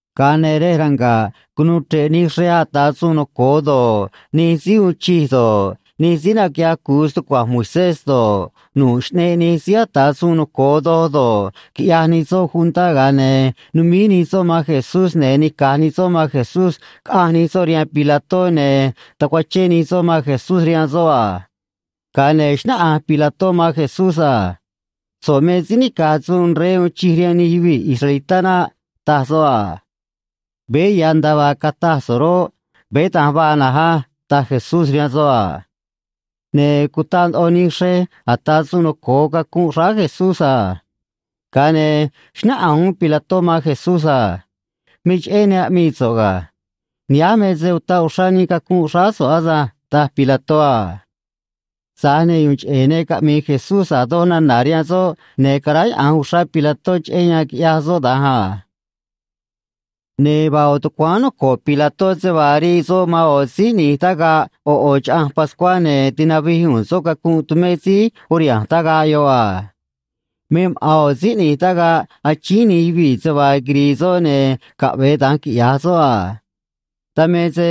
Ga̱a ne̱ rej ranga̱ꞌ cunuu chre̱ꞌ nij xrej ata̱ suun noco̱o do̱ꞌ, nij síí uun chij do̱ꞌ, nij síí naquiꞌyaj cu̱u stucua̱nj Moisés do̱ꞌ, nu̱ꞌ Xꞌneꞌ Nij Síí Ata̱ Suun Noco̱o Doj do̱ꞌ, quiꞌyaj nij soꞌ juntá, ga̱a ne̱ numíj nij soꞌ man Jesús, ne̱ nica̱j nij soꞌ man Jesús caꞌanj nij soꞌ rihaan Pilató, ne̱ tacuachén nij soꞌ man Jesús rihaan soꞌ a. Ga̱a ne̱ xnáꞌanj Pilató man Jesús a: ―So̱ꞌ me síí nica̱j suun rey uun chij rihaan nij yuvii̱ israelitá naꞌ ―taj soꞌ a. ―Veé ya̱ nda̱a vaa cataj so̱ꞌ roꞌ, veé da̱nj vaa na̱nj á ―taj Jesús rihaan soꞌ a. Ne̱ cutaꞌ ndoꞌo nij xrej ata̱ suun noco̱o cacunꞌ xráá Jesús a. Ga̱a ne̱ xnáꞌanj uún Pilató man Jesús a: ―Me cheꞌé ne aꞌmii so̱ꞌ ga̱. Nihánj me se utaꞌ uxrá nii cacunꞌ xráá so̱ꞌ asânj ―taj Pilató a. Tza̱j ne̱ yu̱u̱n cheꞌe̱ ne caꞌmi̱i̱ Jesús a̱ doj nana̱ rihaan soꞌ, ne̱ caráyaꞌa̱nj uxrá Pilató cheꞌé yan quiꞌyaj soꞌ da̱nj a. Ne̱ vaa ꞌo̱ tucuáán noco̱ꞌ Pilató se vaa rii soꞌ man ꞌo̱ síí ꞌni̱j tagaꞌ ꞌo̱ ꞌo̱ Chaꞌanj Pascuá, ne̱ tinavij u̱u̱n soꞌ cacunꞌ tumé síí uriha̱nj tagaꞌ yoꞌ a. Me maꞌa̱n ꞌo̱ síí ꞌni̱j tagaꞌ achíín nij yuvii̱ se vaa quiri̱i̱ soꞌ, ne̱ caꞌve̱e da̱nj quiꞌya̱j soꞌ a. Dan me se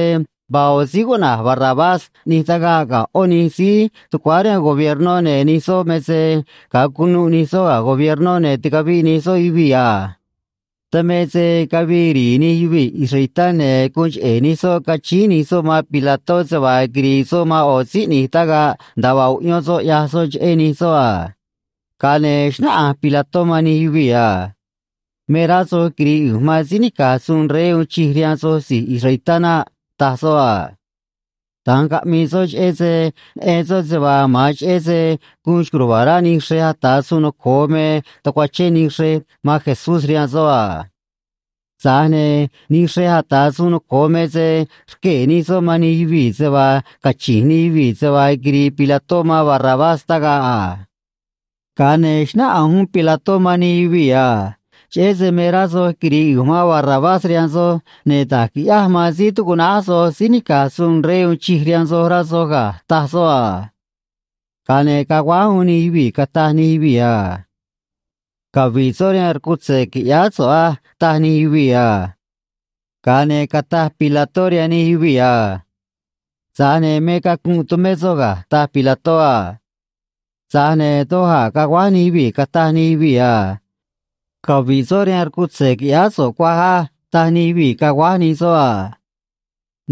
vaa ꞌo̱ síí cuꞌna̱j Barrabás ꞌni̱j tagaꞌ ga̱ ꞌó nij síí tucuáá rihaan gobiernó, ne̱ nij soꞌ me se ga̱a cunuꞌ nij soꞌ ga̱ gobiernó, ne̱ ticaviꞌ nij soꞌ yuvii̱ a. Dan me se cavii ri̱i̱ nij yuvii̱ israelitá, ne̱ guun cheꞌe̱ nij soꞌ cachíín nij soꞌ man Pilató se vaa quiri̱i̱ soꞌ man ꞌo̱ síí ꞌni̱j tagaꞌ nda̱a vaa uꞌyón soꞌ ꞌyaj soꞌ cheꞌé nij soꞌ a. Ga̱a ne̱ xnáꞌanj Pilató man nij yuvii̱ a: ―Me rá soj quiri̱i̱ ꞌu̱nj man síí nica̱j suun rey uun chij rihaan soj si̱j israelitá naꞌ ―taj soꞌ a. Da̱nj caꞌmii soꞌ, cheꞌé se neꞌen soꞌ se vaa ma̱an cheꞌé se guun xco̱j ruva̱a̱ rá nij xrej ata̱ suun noco̱o me tacuachén nij xrej man Jesús rihaan soꞌ a. Tza̱j ne̱ nij xrej ata̱ suun noco̱o me se rquee̱ nij soꞌ man nij yuvii̱ se vaa cachi̱nj nij yuvii̱ se vaa quiri̱i̱ Pilató man Barrabás tagaꞌ a. Ga̱a ne̱ xnáꞌanj uún Pilató man nij yuvii̱ a: ―Cheꞌé se me rá soj quiri̱i̱ ꞌu̱nj man Barrabás rihaan soj, ne̱ da̱j qui̱ꞌyáj man síí tucuꞌnáj soj síí nica̱j suun rey uun chij rihaan soj rá soj ga̱ ―taj soꞌ a. Ga̱a ne̱ caguáj uún nij yuvii̱, cataj nij yuvii̱ a: ―Cavi̱ꞌ soꞌ rihaan rcutze̱, qui̱ꞌyáá so̱ꞌ á ―taj nij yuvii̱ a. Ga̱a ne̱ cataj Pilató rihaan nij yuvii̱ a: ―Tza̱j ne̱ me cacunꞌ tumé soꞌ ga̱ ―taj Pilató a. Tza̱j ne̱ doj a̱ caguáj nij yuvii̱, cataj nij yuvii̱ a: ―Cavi̱ꞌ soꞌ rihaan rcutze̱, qui̱ꞌyáá so̱ꞌ cuaj á ―taj nij yuvii̱ caguáj nij soꞌ a.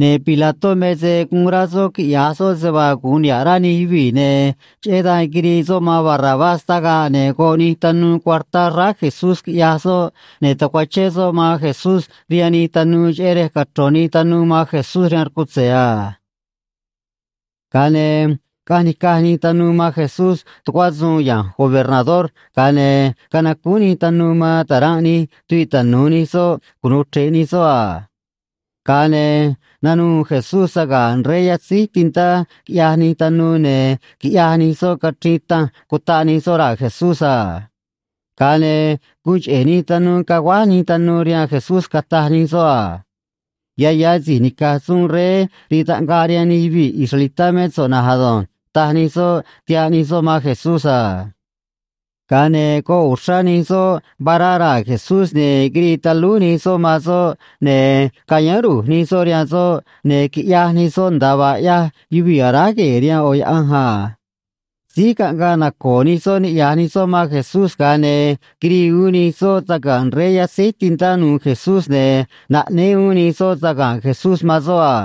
Ne̱ Pilató me se guun rá soꞌ quiꞌya̱j soꞌ se vaa gu̱un niha̱ꞌ rá nij yuvii̱, ne̱ cheꞌé dan quirii soꞌ man Barrabás tagaꞌ, ne̱ goꞌ nij tanuu cuartá xráá Jesús, quiꞌyaj soꞌ, ne̱ tacuachén soꞌ man Jesús rihaan nij tanuu cheꞌé rej cachro̱n nij tanuu man Jesús rihaan rcutze̱ a. Ga̱a ne̱ caꞌanj nica̱j nij tanuu man Jesús tucuá suun ya̱nj gobernador, ga̱a ne̱ canacúún nij tanuu man ta̱ranꞌ nij tuviꞌ tanu̱u nij soꞌ cunu̱u chre̱ꞌ nij soꞌ a. Ga̱a ne̱ nanuû Jesús saga̱nꞌ rey yatzíj tintá, quiꞌyaj nij tanuu, ne̱ quiꞌyaj nij soꞌ cachriin tanj, cutaꞌ nij soꞌ raa̱ Jesús a. Ga̱a ne̱ guun cheꞌe̱ nij tanuu caguáj nij tanuu rihaan Jesús, cataj nij soꞌ a: ―Ya̱ ya̱ si̱j nica̱j suun rey rii taꞌngaꞌ rihaan nij yuvii̱ israelitá mé so̱ꞌ na̱nj ado̱nj ―taj nij soꞌ, tihaꞌ nij soꞌ man Jesús a. Ga̱a ne̱ goꞌ uxrá nij soꞌ vará raa̱ Jesús, ne̱ quirii talúj nij soꞌ man soꞌ, ne̱ cayáán ru̱j nij soꞌ rihaan soꞌ, ne̱ quiꞌyaj nij soꞌ nda̱a vaa ꞌyaj yuvii̱ aráj gue̱e̱ rihaan ꞌo̱ yaꞌanj a. Síj caꞌngaꞌ naco̱o̱ nij soꞌ niꞌya̱j nij soꞌ man Jesús, ga̱a ne̱ quirii uún nij soꞌ saga̱nꞌ rey yatzéj tintá nu̱u̱ Jesús, ne̱ naꞌnéé uún nij soꞌ saga̱nꞌ Jesús man soꞌ a.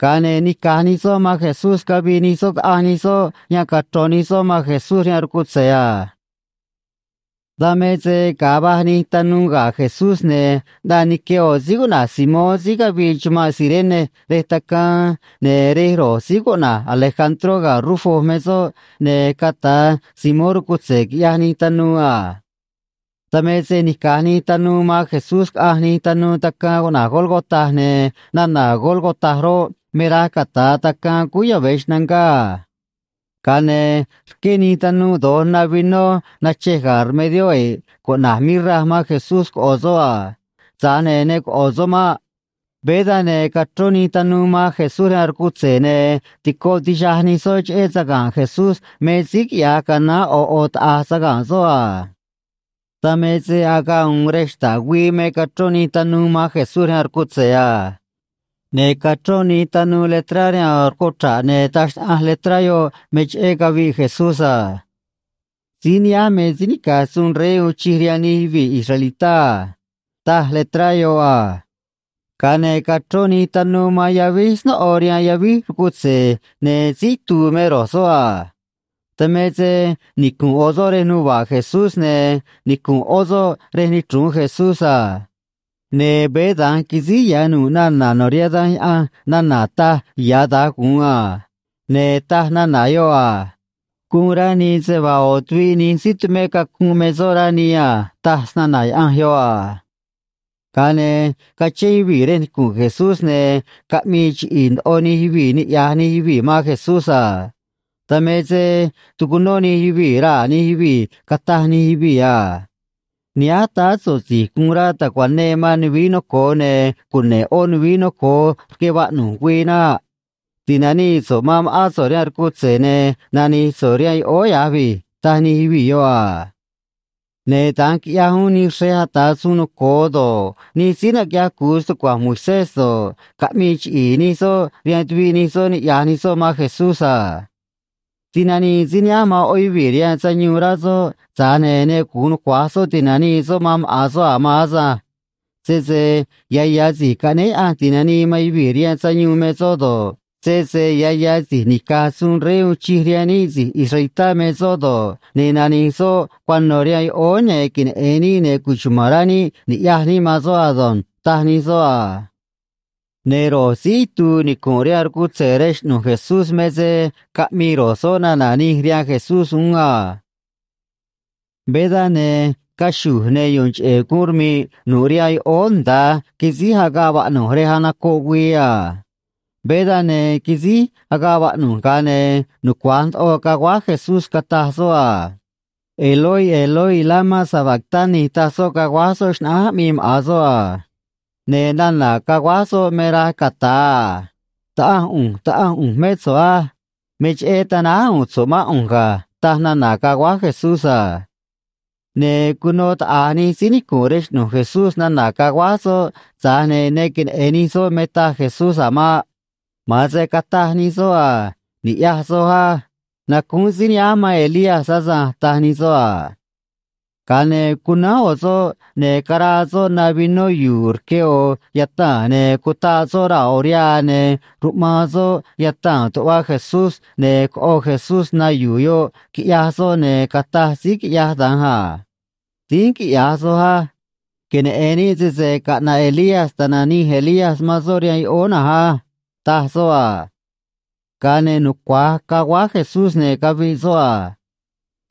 Ga̱a ne̱ nica̱j nij soꞌ man Jesús cavii nij soꞌ caꞌanj nij soꞌ yan cachro̱n nij soꞌ man Jesús rihaan rcutze̱ a. Dan me se ga̱a va̱j nij tanuu ga̱ Jesús, ne̱ ꞌnaꞌ nique ꞌo̱ síí cuꞌna̱j Simón síí cavii chumanꞌ Cirene rej tacaan, ne̱ rej ro̱j síí cuꞌna̱j Alejandró ga̱ Rufo me soꞌ, ne̱ cata̱ Simón rcutze̱ quiꞌyaj nij tanuu a. Dan me se nica̱j nij tanuu man Jesús caꞌanj nij tanuu tacaan cuꞌna̱j Gólgota, ne̱ nana̱ Gólgota roꞌ, me raj cata̱a Tacaan Cúú Yave̱ Xnangá a. Ga̱a ne̱ rqué nij tanuu do̱j na vinó nachej ga̱ rmedió e̱ꞌ cuꞌna̱j “mirra” man Jesús coꞌo̱ soꞌ a. Tza̱j ne̱ ne coꞌo̱ soꞌ maꞌ. Veé dan, ne̱ cachrón nij tanuu man Jesús rihaan rcutze̱, ne̱ tico tixaj nij soꞌ cheꞌé saga̱nꞌ Jesús me síí quiꞌya̱j canaán ꞌo̱ ꞌo̱ taꞌa̱j saga̱nꞌ soꞌ a. Dan me se agaꞌ u̱u̱n rej xta̱ꞌ güii me cachrón nij tanuu man Jesús rihaan rcutze̱ a. Ne̱ cachrón nij tanuu letrá rihaan ꞌo̱ rcuchra̱ꞌ, ne̱ taj xnaꞌanj letrá yoꞌ me cheꞌé cavi̱ꞌ Jesús a: “Síí nihánj me síí nica̱j suun rey uun chij rihaan nij yuvii̱ israelitá a”, taj letrá yoꞌ a. Ga̱a ne̱ cachrón nij tanuu man yavíj snóꞌo rihaan yavíj rcutze̱, ne̱ síí itu̱u̱ me ro̱j soꞌ a. Dan me se nicu̱nꞌ ꞌo̱ soꞌ rej nuva̱ꞌ Jesús, ne̱ nicu̱nꞌ ꞌó soꞌ rej nichru̱un Jesús a. Ne̱ veé da̱nj quisíj ya̱ nu̱ꞌ nana̱ no̱ rihaan Danj Yaꞌanj nana̱ taj ya̱ da̱j gu̱un a. Ne̱ taj nana̱ yoꞌ a: “Guun rá nii se vaa ꞌo̱ tuviꞌ nij síí tumé cacunꞌ me soꞌ, rá nii a”, taj snana̱ Yaꞌanj yoꞌ a. Ga̱a ne̱ cachén yuvii̱ rej nicu̱nꞌ Jesús, ne̱ caꞌmii chiꞌi̱i̱ ndoꞌo nij yuvii̱ niꞌya̱j nij yuvii̱ man Jesús a. Dan me se tucunó nij yuvii̱ raa̱ nij yuvii̱, cataj nij yuvii̱ a: ―Nihánj táá so̱ꞌ si̱j guun rá ta̱cuanee man nuvií noco̱o ne̱ cune̱ꞌ ꞌó nuvií noco̱o rque vaꞌnu̱j güii naꞌ. Ti̱nanii so̱ꞌ man ma̱ꞌán so̱ꞌ rihaan rcutze̱, ne̱ nani̱j so̱ꞌ rihaan yoꞌóó ya̱j vi̱j ―taj nij yuvii̱ yoꞌ a. Ne̱ da̱nj quiꞌyaj uún nij xrej ata̱ suun noco̱o do̱ꞌ, nij síí naquiꞌyaj cu̱u stucua̱nj Moisés do̱ꞌ, caꞌmii chiꞌi̱i̱ nij soꞌ rihaan tuviꞌ nij soꞌ niꞌya̱j nij soꞌ man Jesús a: ―Tinanii síí nihánj man ꞌó yuvii̱ rihaan sayuun, rá soꞌ, tza̱j ne̱ ne gu̱un nucua̱j soꞌ ti̱nanii soꞌ man maꞌa̱n soꞌ a̱ maan asânj. Sese ya̱ ya̱ Si̱j Caꞌnéé Yaꞌanj Ti̱nanii man Yuvii̱ rihaan Sayuun me soꞌ do̱ꞌ, sese ya̱ ya̱ si̱j nica̱j suun rey uun chij rihaan níꞌ si̱j israelitá me soꞌ do̱ꞌ, ne̱ nani̱j soꞌ cuano̱ rihaan yoꞌóó, ne̱ queneꞌe̱n níꞌ, ne̱ cuchuma̱n rá níꞌ ni̱ꞌyaj níꞌ man soꞌ ado̱nj ―taj nij soꞌ a. Ne̱ ro̱j síí itu̱u̱ nicu̱nꞌ rihaan rcutze̱ rej xꞌnu̱j Jesús me se caꞌmii ro̱j soꞌ nana̱ nij rihaan Jesús uún a. Veé dan, ne̱ caxu̱j, ne̱ yu̱u̱n cheꞌe̱ guun rmi̱ꞌ nu̱ꞌ rihaan yoꞌóó nda̱a quisíj agaꞌ vaꞌnu̱j rej anocoꞌ güii a. Veé dan, ne̱ quisíj agaꞌ vaꞌnu̱j, ga̱a ne̱ nucua̱j ndoꞌo caguáj Jesús, cataj soꞌ a: ―Eloi, Eloi, lama sabactani ―taj soꞌ, caguáj soꞌ xnaꞌánj aꞌmii maꞌa̱n soꞌ a. Ne̱ nana̱ caguáj soꞌ me raj cata̱a a: Taꞌanj ꞌu̱nj, Taꞌanj ꞌu̱nj mé so̱ꞌ á. Me cheꞌé tanáj u̱u̱n so̱ꞌ mán ꞌu̱nj ga̱, taj nana̱ caguáj Jesús a. Ne̱ cuno taꞌa̱j nij síí nicu̱nꞌ rej xꞌnu̱j Jesús nana̱ caguáj soꞌ, tza̱j ne̱ ne queneꞌe̱n nij soꞌ me taj Jesús a̱ maꞌ. Ma̱an se cataj nij soꞌ a: ―Ni̱ꞌyaj soj á. Nacúún síí nihánj man Elías asânj ―taj nij soꞌ a. Ga̱a ne̱ cunánj ꞌo̱ soꞌ, ne̱ caraa soꞌ na vinó yu̱u̱ rque ꞌo̱ yataa̱n, ne̱ cutaꞌ soꞌ raa̱ ꞌo̱ rihaa, ne̱ ruꞌmaan soꞌ yataa̱n tuꞌva Jesús, ne̱ coꞌo Jesús na yu̱u̱ yoꞌ, quiꞌyaj soꞌ, ne̱ cataj síí quiꞌyaj da̱nj a: ―Dínj quiꞌya̱j soj á. Queneꞌe̱n níꞌ sese caꞌna̱ꞌ Elías ta̱nanij Elías man soꞌ rihaan yoꞌóó na̱nj á ―taj soꞌ a. Ga̱a ne̱ nucua̱j caguáj Jesús, ne̱ caviꞌ soꞌ a.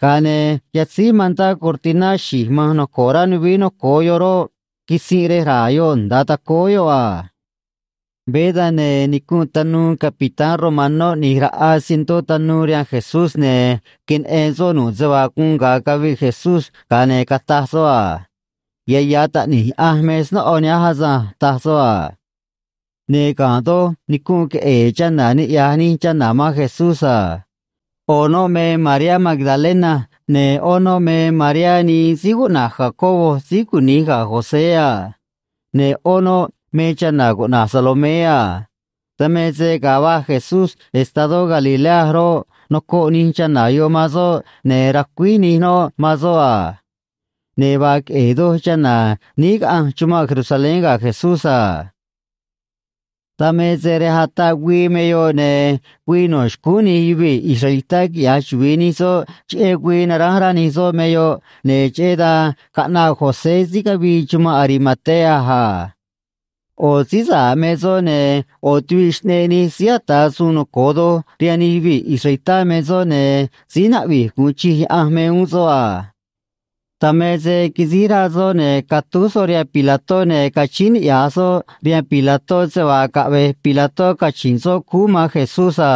Ga̱a ne̱ yatzíj mantá cortiná xi̱j ma̱nj noco̱ꞌ rá nuvií noco̱o yoꞌ roꞌ, quisinꞌ rej raa̱ yoꞌ nda̱a tacóó yoꞌ a. Veé dan, ne̱ nicunꞌ tanuu capitán romanó ꞌni̱j raꞌa cientó tanuu rihaan Jesús, ne̱ queneꞌen soꞌ nu̱ꞌ se vaa guun ga̱a caviꞌ Jesús, ga̱a ne̱ cataj soꞌ a: ―Ya̱ ya̱ Taꞌni̱j Yaꞌanj me snóꞌo nihánj asânj ―taj soꞌ a. Ne̱ ga̱nꞌ doj nicunꞌ queꞌe̱e̱ chana̱, niꞌya̱j nij chana̱ man Jesús a. ꞌO̱ noꞌ me Mariá Magdalena, ne̱ ꞌó noꞌ me Mariá nii síí cuꞌna̱j Jacobo síí cuni̱j ga̱ José a. Ne̱ ꞌó noꞌ me chana̱ cuꞌna̱j Salomé a. Dan me se ga̱a va̱j Jesús estadó Galilea roꞌ, nocoꞌ nij chana̱ yoꞌ man soꞌ ne̱ racuíj nij noꞌ man soꞌ a. Ne̱ vaa queꞌe̱e̱ doj chana̱ níí caꞌanj chumanꞌ Jerusalén ga̱ Jesús a. Dan me se rej ataꞌ güii me yoꞌ, ne̱ güii no̱ xcúún nij yuvii̱ israelitá quiꞌya̱j chuvi̱i nij soꞌ cheꞌé güii naránj rá nij soꞌ me yoꞌ, ne̱ cheꞌé dan caꞌnaꞌ José síí cavii chumanꞌ Arimatea a. ꞌO̱ síí sa̱ꞌ me soꞌ, ne̱ ꞌo̱ tuviꞌ Xꞌneꞌ Nij Síí Ata̱ Suun Noco̱o Doj rihaan nij yuvii̱ israelitá me soꞌ, ne̱ síí naꞌvi̱j gu̱un chij Yaꞌanj me uún soꞌ a. Dan me se quisíj rá soꞌ, ne̱ catúj soꞌ rihaan Pilató, ne̱ cachíín niꞌya̱j soꞌ rihaan Pilató se vaa caꞌve̱j Pilató cachi̱nꞌ soꞌ cúú man Jesús a.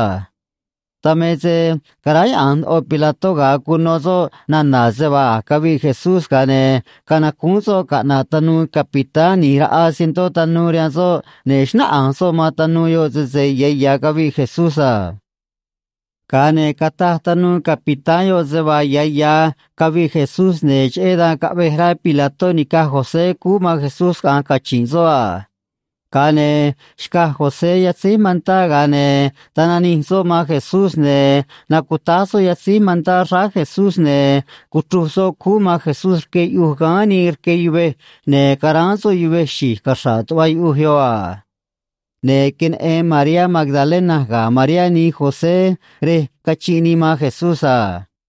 Dan me se caráyaꞌa̱nj ndoꞌo Pilató ga̱a cuno soꞌ nana̱ se vaa a̱j caviꞌ Jesús, ga̱a ne̱ canacúún soꞌ caꞌna̱ꞌ tanuu capitán ꞌni̱j raꞌa cientó tanuu rihaan soꞌ, ne̱ xnáꞌanj soꞌ man tanuu yoꞌ sese ya̱ ya̱ caviꞌ Jesús a. Ga̱a ne̱ cataj tanuu capitán yoꞌ se vaa ya̱ ya̱ caviꞌ Jesús, ne̱ cheꞌé dan caꞌvej rá Pilató ni̱caj José cúú man Jesús caꞌa̱nj cachi̱nj soꞌ a. Ga̱a ne̱ xcaj José yatzéj mantá, ga̱a ne̱ tananij soꞌ man Jesús, ne̱ nacutáj soꞌ yatzéj mantá xráá Jesús, ne̱ cuchruj soꞌ cúú man Jesús rque yuꞌuj gáán nii rque yuvej, ne̱ caráán soꞌ yuvej xi̱j caxra̱ꞌ tuꞌva yuꞌuj yoꞌ a. Ne̱ queneꞌen Mariá Magdalena ga̱ Mariá nii José rej cachinꞌ nii man Jesús a.